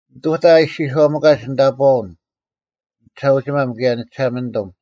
ᓂᑐᑕ ᐊ ᐃᔅᒋᔄᒥᑲᒡ ᓂᑕᑈᐅᓐ, ᓂᒋᓴᐅᒋᒪᒻ, ᑭᔭ ᓂᒋᓴᒪᓂᑐᒻ: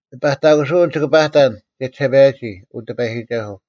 ᓂᐸᑕᑯᓯᐅᓐ ᒋᑭ ᐸᑕᓐ ᒋᔭᒋᓴᐸᔭᒋ, ᐅ ᑎᐸᔨᒋᒐᓱᐤ;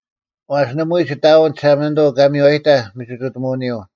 ᐛᔅ ᓇᒪᐎᔾ ᒋᑦ ᐊᐎᓐ ᒋᓴᒪᓂᑐᐤ ᑲ ᒥᔽᔨᑕᐧᒃ ᒥᒋᑐᑎᒧᐅᓂᔪᐤ;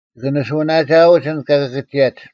ᒋᑭ ᓂᓱᐅᓇᒋᐊᐅᒡ ᐊᓐᒡ ᑲ ᑭᑭᒋᔭᒡ: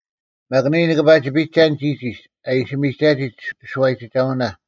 ᒪᒃ ᓂᔾ ᓂᑭ ᐸᒋ ᐱᒐᓐ ᒋᒋᒡ ᐊ ᐃᓯ ᒪᒥᒐᒋ ᒋᓱᐛᔨᒋᒐᐅᓇ;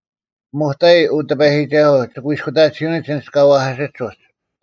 ᐱᒧᑕᐃ, ᐅ ᑎᐸᔨᒋᒐᓱᐤ, ᒋᑯᐃᔅᑯᑕᑎᓯᐅᓂᒡ ᐊᓐᒡ ᑲ ᐛᐧᑲᓯᒡ ᐅᒡ;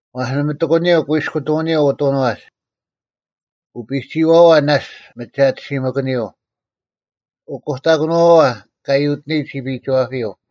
ᐛᔅ ᓇᒪ ᑎᒂᓂᔪᐤ ᑯᐃᔅᑯᑐᐅᓂᔪᐤ ᐅᑐᓄᐛᒡ; ᐅᐱᒋᔭᐛᐛ ᓇᔅᒡ ᒥᒐᑎᓯᒪᑭᓂᔪᐤ; ᐅᑯᑕᑭᓄᐛᐛ ᑲ ᔪᑕᑯᑕᔨᒡ ᒋᐱᐃᒋᐛᐱᔪᐤ;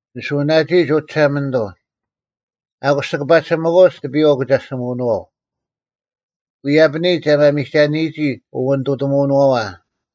ᓂᓱᐅᓇᒋᐃᒡ, ᐅ ᒋᓴᒪᓂᑐᐤ; ᐊᑯᔅ ᒋᑭ ᐸᒋᓯᒥᑯᐅᒡ ᑎᐱᔪᐛ ᐅᑭᒐᔅᒋᒧᐛᐅᓄᐛᐤ; ᐎᔪᐛᐱᓂᒡ ᐊ ᒪᒥᒐᓂᔨᒋ ᐅᐛᓂᑐᑎᒧᐅᓄᐛᐛ;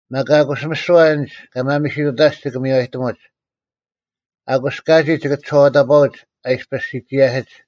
ᒪᒃ ᐊᑯᔅ ᒥᓯᐛ ᐊᓐᒡ ᑲ ᒪᒥᓯᑐᑕᔅᒡ ᒋᑭ ᒥᔽᔨᑎᒧᒡ: ᐊᑯᔅ ᑲᒋᒡ ᒋᑭ ᒋᔄᐛᑕᑈᐅᒡ ᐊ ᐃᔅᐱᔅ ᓯᒋᔭᓯᒡ;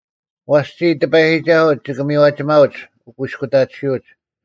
ᐛᔅ ᒋᔾ, ᑎᐸᔨᒋᒐᓱᐤ, ᒋᑭ ᒥᔽᒋᒪᐅᒡ ᐅᑯᐃᔅᑯᑕᑎᓯᐅᒡ;